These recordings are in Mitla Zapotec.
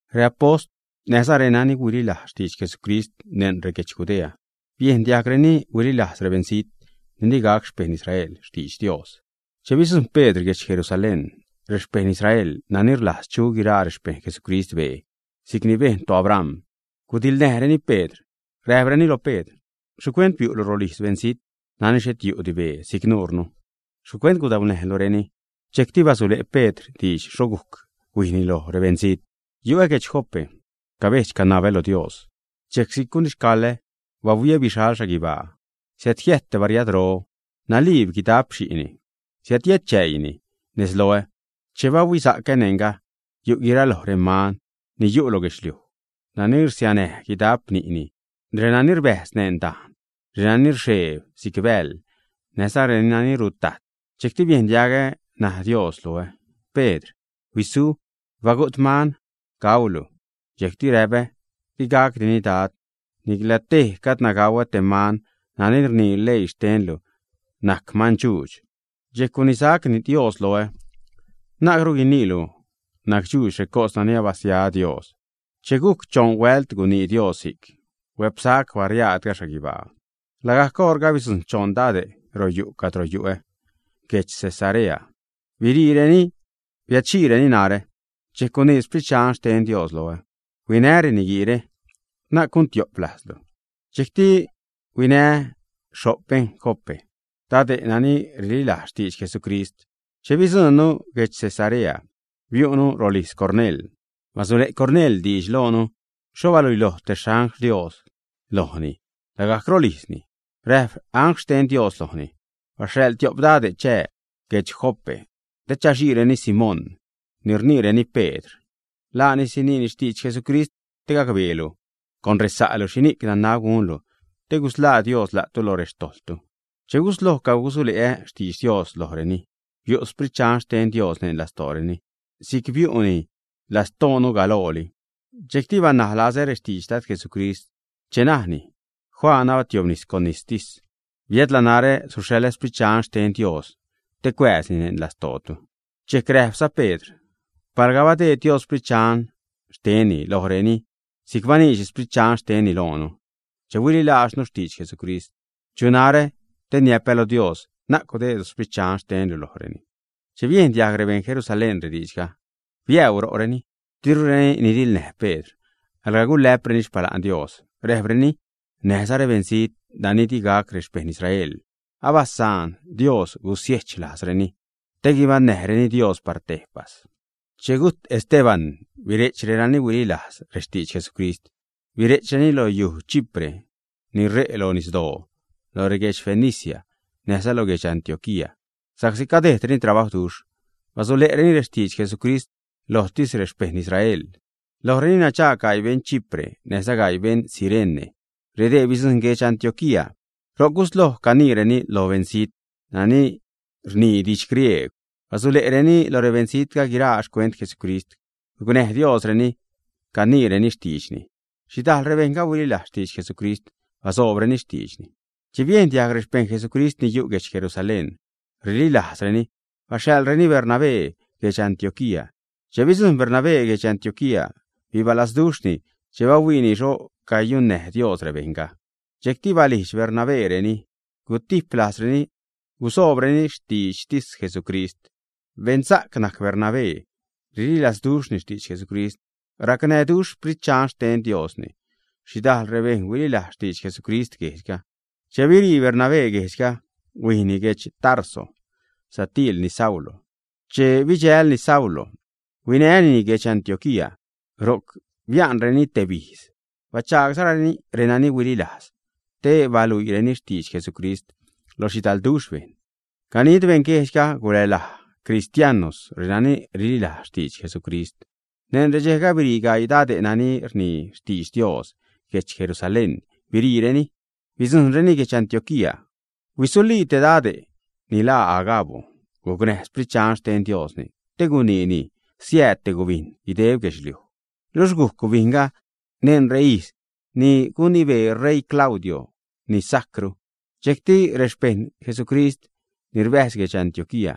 Reapost, näjza renani huililajz xtidx Jesucrist neṉ reguedx Judea, biejn diajgreni huililajz rebeṉzijt ni digac xpejṉ Israel xtidx Dios. Che bidzujṉ Pedr guedx Jerusalén, rexpejṉ Israel nani rlajz chu guiraa rexpejṉ Jesucrist bee si'cni bejn toAbram, gudiḻnäjreni Pedr. Räjpreni lo Pedr: ―¿Xhicuent biu'lu rolijz beṉzijt nani xhet yu'di bee si'c nuure? ¿Xhicuent gudaunäjlureni, ä? Dxejcti basule' Pedr diidx xho gujc huijni loj rebeṉzijt: ―Yu'ä guedx Jope. Cabedx-canabä lo Dios, dxejc si'c gunixcaḻä, bahuiä bixal xhaguibaa, siädjiäjt te bariadro, naliib guidap xi'ni. Siädjiätchäiini nez loä. Che bahuisa'cä, neṉga yu' guiraloj reman ni yu' lo guedxliuj nani rsianäj guidap ni'ni, renani rbäjz neṉ dajn, renani rxeeb si'c bäḻ, näjza renani rutajt. Dxejcti biejn diagä naj Dios loä: “Pedr, huisu. Bagu't man gaulu.” Dxejcti räpä: “Digacdini Dad. Nicla tej gadna gauä te man nani rnii leii xtenlu najc mandxuudx.” Dxejc gunisac Dios loä: “Na'cru guiniilu nacdxuudx recos nani abasia Dios.” Che gujc choṉ huält gunii Dios si'c, huä'psac bariaadga xhaguibaa. Lagajc oṟga bidzujṉ choṉ dade' ro yu' cadro yu'ä. Guedx Cesarea biriireni, biädxiireni narä. Dxejc gunii Sprit Dxan xten Dios loä: “Huinä reniguiire. Na'c gun tiop lajzlu.” Dxejcti huinää́ xho'p beṉ Jope, dade' nani rililajz xtidx Jesucrist. Che bidzuṉnu guedx Cesarea, biu'nu rolijz Cornel. Basule' Cornel diidx loonu xho baluiloj te angl xten Dios lojni lagajc rolijzni. Räjp angl xten Dios lojni: “Baxhaḻ tiop dade' chää guedx Jope te chaxiireni Simón ni rniireni Pedr. Laani siniini xtidx Jesucrist te gacbeelu con resa'lu xhini'c nanab gunlu te gusḻaa Dios la'tu lo rextojḻtu.” Che gusloj cagusule'ä xtidx Dios lojreni, biu' Sprit Dxan xten Dios neṉ lastooreni si'c biu'ni lastoonu galooli. Dxejcti banaj lazä rextidx Dad Jesucrist che najni: “Juan abatiobnis con nistis, biädla narä suxhaḻä Sprit Dxan xten Dios te cuääzni neṉ lastootu.” Dxejc räjpza Pedr: ―Palga badeed Dios Sprit Dxan xtenni lojreni si'c baniidxni Sprit Dxan xtenni loonu che huililajznu xtidx Jesucrist, ¿chu narä? te niäpä lo Dios: “Na'c gudeedlu Sprit Dxan xtenlu lojreni.” Che biejn diajg rebeṉ Jerusalén rediidxga, biäuu ro'reni, dirureni nidiḻnäj Pedr. Alga gulä'preni xpala'n Dios, räjpreni: ―Näjza rebeṉzijt nani digac rexpejṉ Israel abasaan Dios gusiechlajzreni te guibaṉnäjreni Dios par tejpas. Che gujt Esteban bire'ch renani huililajz rextidx Jesucrist. Bire'chreni lo yuj Chipre ni ṟe' lo nisdoo, lo reguedx Fenicia, näjza lo guedx Antioquía sa'csi cadejdreni trabajwduxh. Basule'reni rextidx Jesucrist lojtis rexpejṉ Israel. Lojreni nadxaag gaii beṉ Chipre, näjza gaii beṉ Cirene. Redee bidzujṉ guedx Antioquía. Ro'c gusloj caniireni lo beṉzijt nani rnii didx griegw. Basule'reni lo rebeṉzijtga guiraa xcuent Jesucrist. Gucnäj Diosreni caniireni xtiidxni. Xhidajl rebejṉga huililajz xtidx Jesucrist, basoobreni xtiidxni. Che biejn diajg rexpejṉ Jesucrist ni yu' guedx Jerusalén rililajzreni, baxhaḻreni Bernabé guedx Antioquía. Che bidzujṉ Bernabé guedx Antioquía, bibalazduxhni che bahuiini xho cayunnäj Dios rebejṉga. Dxejcti balijdx Bernabéreni: gutijp lajzreni gusoobreni xtiidxtis Jesucrist. Beṉsa'c najc Bernabé. Rililazduxhni xtidx Jesucrist. Racnäjduxh Sprit Dxan xten Diosni. Xhidajl rebejṉ huililajz xtidx Jesucrist guejdxga. Che birii Bernabé guejdxga, huijni guedx Tarso satiilni Saulo. Che bidxälni Saulo, huinänini guedx Antioquía. Ro'c bia'nreni tebijz, bachagsa'reni renani huililajz te baluiireni xtidx Jesucrist lo xhidalduxh bejṉ. Ganid beṉguejdxga gulälaj “Cristianos” renani rililajz xtidx Jesucrist. Neṉ redxejga birii gaii dade' nani rnii xtidx Dios. Guedx Jerusalén biriireni, bidzujṉreni guedx Antioquía. Huisulii te dade'ga ni laa Agabo. Gucnäj Sprit Dxan xten Diosni te guniini siääd te gubijn guideb guedxliuj. Luxh gujc gubijnga neṉ reijz ni gunibee ṟeii Claudio ni sajcru. Dxejcti rexpejṉ Jesucrist ni rbäjz guedx Antioquía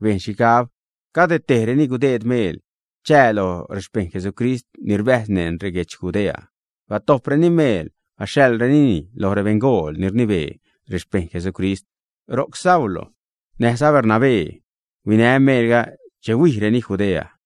bejn xhigab cade tejreni gudeed meel chää lo rexpejṉ Jesucrist ni rbäjz neṉ reguedx Judea. Batojpreni meel, baxhaḻrenini lo rebeṉgool ni rnibee rexpejṉ Jesucrist ro'c. Saulo näjza Bernabé huinä meelga che huijreni Judea.